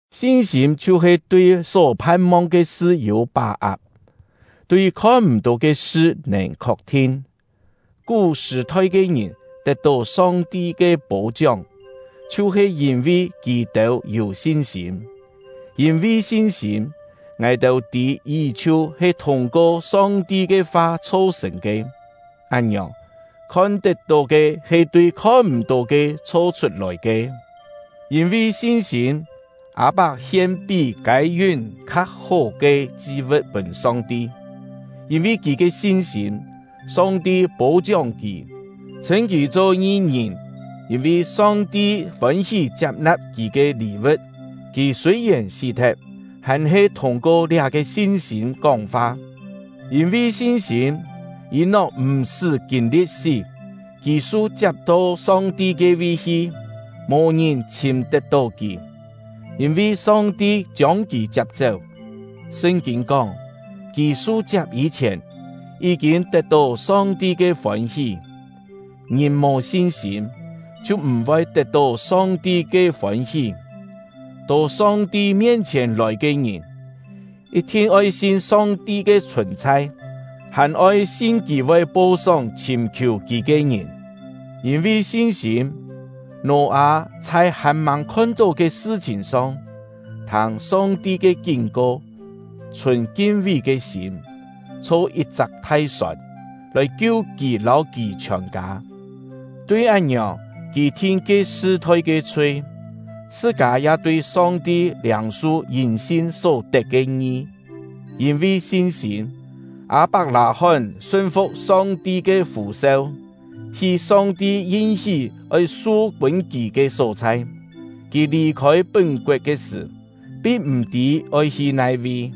Sin-sîm chhiu-he tui só phan-mong ke sṳ yû pá-ak, tui khon-m̀-tó ke sṳ nèn khok-thin. Kú-sṳ̀-thoi ke ngìn tet-tó Song-ti ke pô-chióng, chhiu-he yîn-vi kì-têu yû sin-sîm. Yîn-vi sin-sîm, ngài-têu tî yí-chhiu he thûng-ko Song-ti ke fa chho-sṳ̀n ke; án-ngiòng, khon tet-tó ke he tui khon-m̀-tó ke chho-chhut-lòi ke. Yîn-vi sin-sîm, Â-pak hien pí Kâi-yún kha hó ke chi-vu̍t pûn Song-ti. Yîn-vi kì ke sin-sîm, Song-ti pô-chióng kì, chhṳ̂n kì cho ngi-ngìn, yîn-vi Song-ti fôn-hí chiap-na̍p kì ke lî-vu̍t. Kì sûi-yèn sí-thet, hàn-he thûng-ko liá-ke sin-sîm kóng-fa. Yîn-vi sin-sîm, Yî-nok m̀-sṳ́ kîn-li̍t sí. Kì su-chiap to Song-ti ke-vi hi; mò ngìn chhìm tet-tó kì, yîn-vi Song-ti chiông kì chiap-chéu. Sṳn-kîn kóng, kì su-chiap yî-chhièn, yí-kîn tet-tó Song-ti ke fôn-hí. Ngìn mò sin-sîm, chhiu m̀-voi tet-tó Song-ti ke fôn-hí. To Song-ti mien-chhièn lòi ke ngìn, yit-thin oi sin Song-ti ke chhùn-chhai, hàn-oi sin Kì voi po-sóng chhìm-khiù Kì ke ngìn. Yîn-vi sin-sîm, Nò-â chhai hàn-màng khon-tó ke sṳ-chhìn song, thâng Song-ti ke kín-ko, chhùn kin-vi ke sîm, chho yit-chak thai-sòn, lòi kiu kì lâu kì chhiòn-kâ. Tui án-ngiòng, kì thin ke sṳ-thoi ke chhui, chhṳ-kâ ya tui Song-ti liâng-su yîn sin só tet ke ngi. Yîn-vi sin-sîm, Â-pak-lâ-hón sun-fu̍k Song-ti ke fû-seu, hi Song-ti yin-hí oi su pûn kì ke só-chhai. Kì lì-khôi pún-koet ke sṳ̀, pin m̀-tî oi hi nai-vi.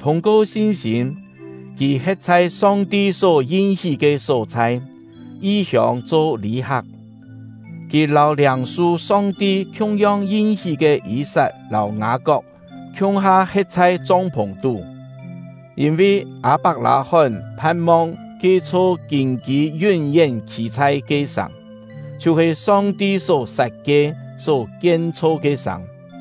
Thûng-ko sin-sîm, kì he̍t chhai Song-ti só yin-hí ke só-chhai, yi-hiông cho lî-hak; kì lâu liâng-su Song-ti khiung-yong yin-hí ke Yî-sat lâu Ngâ-kok khiung-ha he̍t chhai chong-phùng-tú. Yîn-vi Â-pak-lâ-hón phan-mong ke-chho kîn-kî yún-yén khî-chhai ke sàng, chhiu-he Song-ti só sat-kie, só kien-chho ke sàng.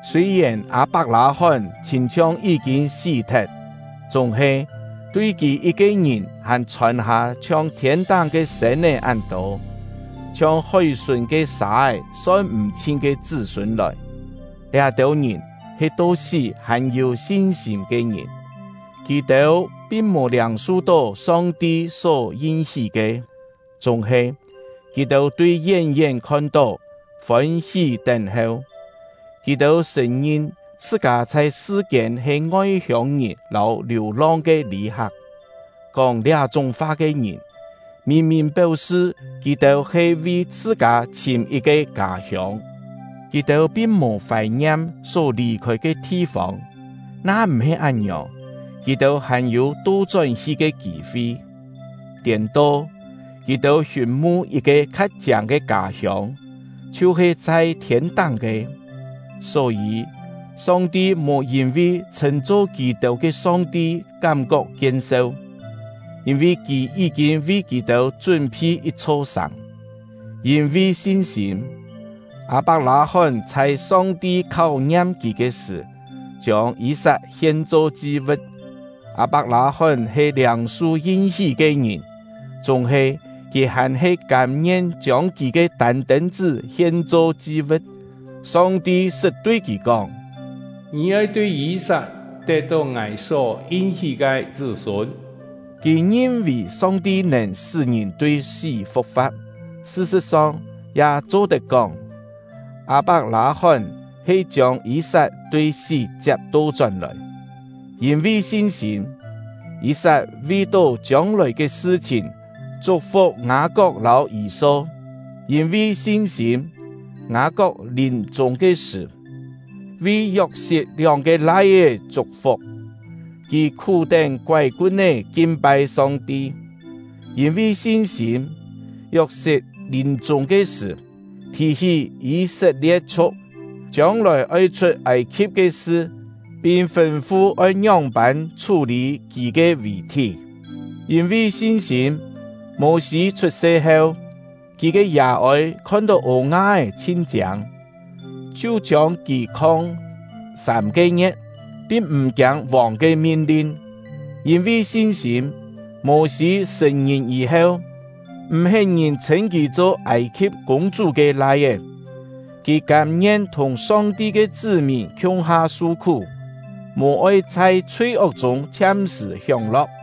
Sûi-yèn Â-pak-lâ-hón chhîn-chhiong yí-kîn sí-thet, chúng-he, tui kì yit-ke ngìn hàn chhòn-hâ chhiong thiên-táng ke sên-é án tô, chhiong hói-sùn ke sâ-é son m̀-chhin ke chṳ́-sûn lòi! Liá-têu ngìn he to sí hàn-yû sin-sîm ke ngìn. Kì-têu pin mò liâng-su-tó Song-ti só yin-hí ke; chúng-he, kì-têu tui yén-yén khon-tó, fôn-hí tén-heu. Kì-têu sṳ̀n-ngin chhṳ-kâ chhai sṳ-kiên he ngoi-hiông-ngìn lâu liù-long ke lî-hak. Kóng liá-chúng fa ke ngìn, mìn-mìn péu-sṳ kì-têu he vi chhṳ-kâ chhìm yit-ke kâ-hiông. Kì-têu pin mò fài-ngiam só lì-khôi ke thi-fông, na m̀-he án-ngiòng, kì-têu hàn-yû to-chón-hi ke kî-fi. Tiên-to, kì-têu hiûn-mu yit-ke kha chiâng ke kâ-hiông, chhiu-he chhai thiên-táng ke; só-yî, Song-ti mò yîn-vi chhṳ̂n-cho kì-têu ke Song-ti kám-kok kien-seu, yîn-vi Kì yí-kîn vi kì-têu chún-phi yit-chho sàng. Yîn-vi sin-sîm, Â-pak-lâ-hón chhai Song-ti kháu-ngiam kì ke sṳ̀, chiông Yî-sat hien-cho chi-vu̍t. Â-pak-lâ-hón he liâng-su yin-hí ke ngìn, chúng-he kì hàn-he kâm-ngien chiông kì ke tân-tên-chṳ́ hien-cho chi-vu̍t. Song-ti sṳt tui kì kóng: “Ngì oi tui Yî-sat tet-tó Ngài só yin-hí ke chṳ́-sûn.” Kì ngin-vì Song-ti nèn sṳ́ ngìn tui sí fu̍k-fa̍t. Sṳ-sṳ̍t-song, ya cho-tet kóng, Â-pak-lâ-hón he chiông Yî-sat tui sí chiap to-chón-lòi. Yîn-vi sin-sîm, Yî-sat vi-tó chiông-lòi ke sṳ-chhìn chuk-fuk Ngâ-kok lâu Yî-so. Yîn-vi sin-sîm, Ngâ-kok lìm-chûng ke sṳ̀, vi Yok-sit lióng-ke lai-é chuk-fuk; kì khú-tén koái-kun-é kin-pai Song-ti. Yîn-vi sin-sîm, Yok-sit lìm-chûng ke sṳ̀, thì-hí Yî-set-lie̍t-chhu̍k chiông-lòi oi chhut Âi-khi̍p ke sṳ, pin fûn-fu oi ngióng-pân chhú-lî kì ke vì-thí. Yîn-vi sin-sîm, Mô-sî chhut-se heu, kì ke yà-ôi khon-tó ô-nga-é chhin chiâng, chhiu chiông kì khong sâm-ke ngie̍t, pin m̀ kiâng vòng ke min-lin. Yîn-vi sin-sîm, Mô-sî sṳ̀n-ngìn yî-heu, m̀-hén ngìn chhṳ̂n kì cho Âi-khi̍p kûng-chú ke lai-é. Kì kâm-ngien thùng Song-ti ke chṳ́-mìn khiung-ha su-khú, mò-oi chhai chhui-ok chûng chhiam-sṳ̀ hióng-lo̍k.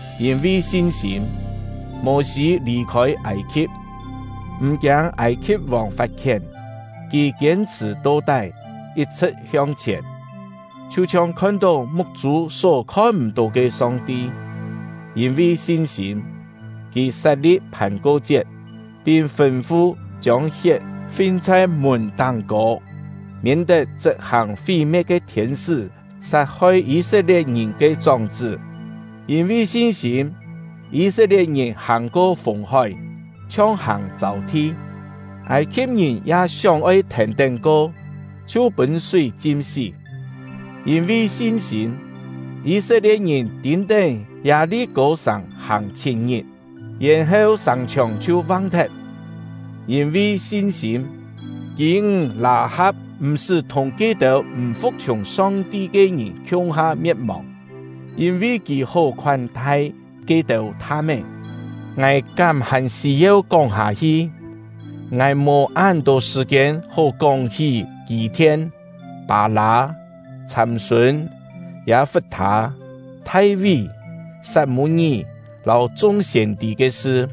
Yîn-vi sin-sîm, Mô-sî lì-khôi Âi-khi̍p, m̀ kiâng Âi-khi̍p-vòng fat-khién; kì kiên-chhṳ̀ to-tái, yit-chhṳ̍t hiong-chhièn, chhiu-chhiong khon-tó muk-chû só khon-m̀-tó ke Song-ti. Yîn-vi sin-sîm, kì sat-li̍p Phàn-ko-chiet, pin fûn-fu chiông hiet fin chhai mùn táng-kô, miên-tet chṳp-hàng fí-me̍t ke thiên-sṳ́ sat-hoi Yî-set-lie̍t-ngìn ke chóng-chṳ́. Yîn-vi sin-sîm, Yî-set-lie̍t-ngìn hàng-ko Fùng-hói, chhiong hàng châu-thi; Âi-khi̍p-ngìn ya sióng-oi thèn-tén ko, chhiu pûn súi chim-sí. Yîn-vi sin-sîm, Yî-set-lie̍t-ngìn tîn-tén Yâ-li-kô-sàng hàng chhit-ngit, yèn-heu sàng-chhiòng chhiu vang-thet. Yîn-vi sin-sîm, kî-ńg Lâ-ha̍p m̀-sṳ́ thùng ke-têu m̀ fu̍k-chhiùng Song-ti ke ngìn khiung-ha me̍t-mòng, yîn-vi kì hó khoán-thai ke-têu tham-é. Ngài kám hàn sî-yeu kóng-hâ-hi? Ngài mò án-tô sṳ̀-kiên hó kóng-hí Kî-thien, Pâ-lâ, Chhâm-sûn, Yâ-fut-thâ, Thai-ví, Sat-mû-ngí, lâu chung siên-tî ke sṳ.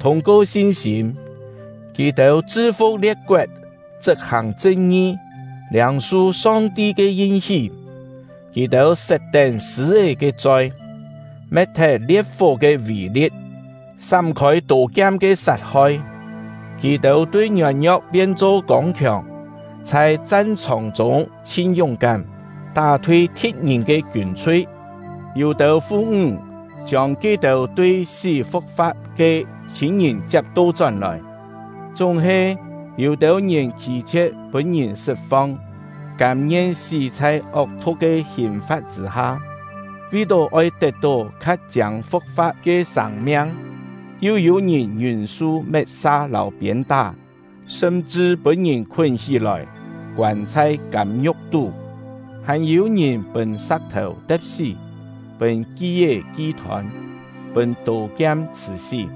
Thûng-ko sin-sîm, kì-têu chṳ-fu̍k lie̍t-koet, chṳp-hàng chṳn-ngi, liâng-su Song-ti ke yin-hí; kì-têu set-tén sṳ̂-é ke choi, me̍t-thet lie̍t-fó ke vî-li̍t, sám-khôi tô-kiam ke sat-hoi; kì-têu tui ngiôn-ngio̍k pien-cho kông-khiòng, chhai chan-chhòng-chûng chhin yúng-kám, tá-thui thi̍t-ngìn ke kiûn-chhui. Yû-têu fu-ńg chiông ke-têu tui sí fu̍k-fa̍t ke chhîn-ngìn chiap to-chón-lòi. Chúng-he, yû-têu ngìn khî-chhie̍t pûn-ngìn sṳt-fong, kâm-ngien sí chhai ok-thu̍k ke hìn-fa̍t chṳ̂-ha, vi-tó oi tet-tó kha chiâng fu̍k-fa̍t ke sâng-miang. Yu yû-ngìn ngiûn-su met-sa lâu piên-tá, sṳm-chṳ pûn-ngìn khún hí-lòi, koân chhai kâm-ngiu̍k tú. Hàn yû-ngìn pûn sa̍k-thèu te̍p-sí, pûn ki-é ki-thôn, pûn tô-kiam chhṳ̀-sí.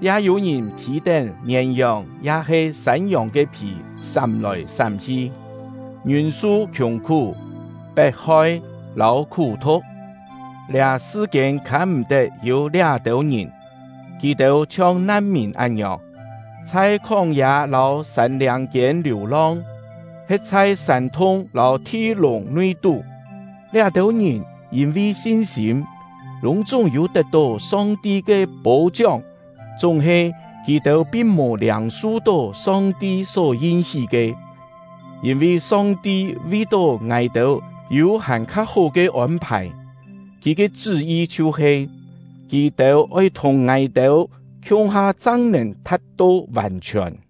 Ya yû-ngìn phî-tén mièn-yòng ya-he sân-yòng ke phì sám-lòi sám-hi, ngiûn-su khiùng-khú, pet-hoi, lâu khú-thu̍k. Liá sṳ-kiên khâm-m̀-tet yû liá-têu ngìn! Kì-têu chhiong nan-mìn án-ngiòng, chhai khóng-yâ lâu sân-liâng-kiên liù-long, he̍t chhai sân-thung lâu thi-lùng nui-tú. Liá-têu ngìn, yîn-vi sin-sîm, lûng-chúng yû tet-tó Song-ti ke pô-chióng; chúng-he kì-têu pin mò liâng-su-tó Song-ti só yin-hí ke. Yîn-vi Song-ti vi-tó ngài-têu yû hàn-kha hó ke ôn-phài; Kì ke chṳ́-yi chhiu-he: Kì-têu oi thùng ngài-têu khiung-ha chang nèn tha̍t-to vàn-chhiòn.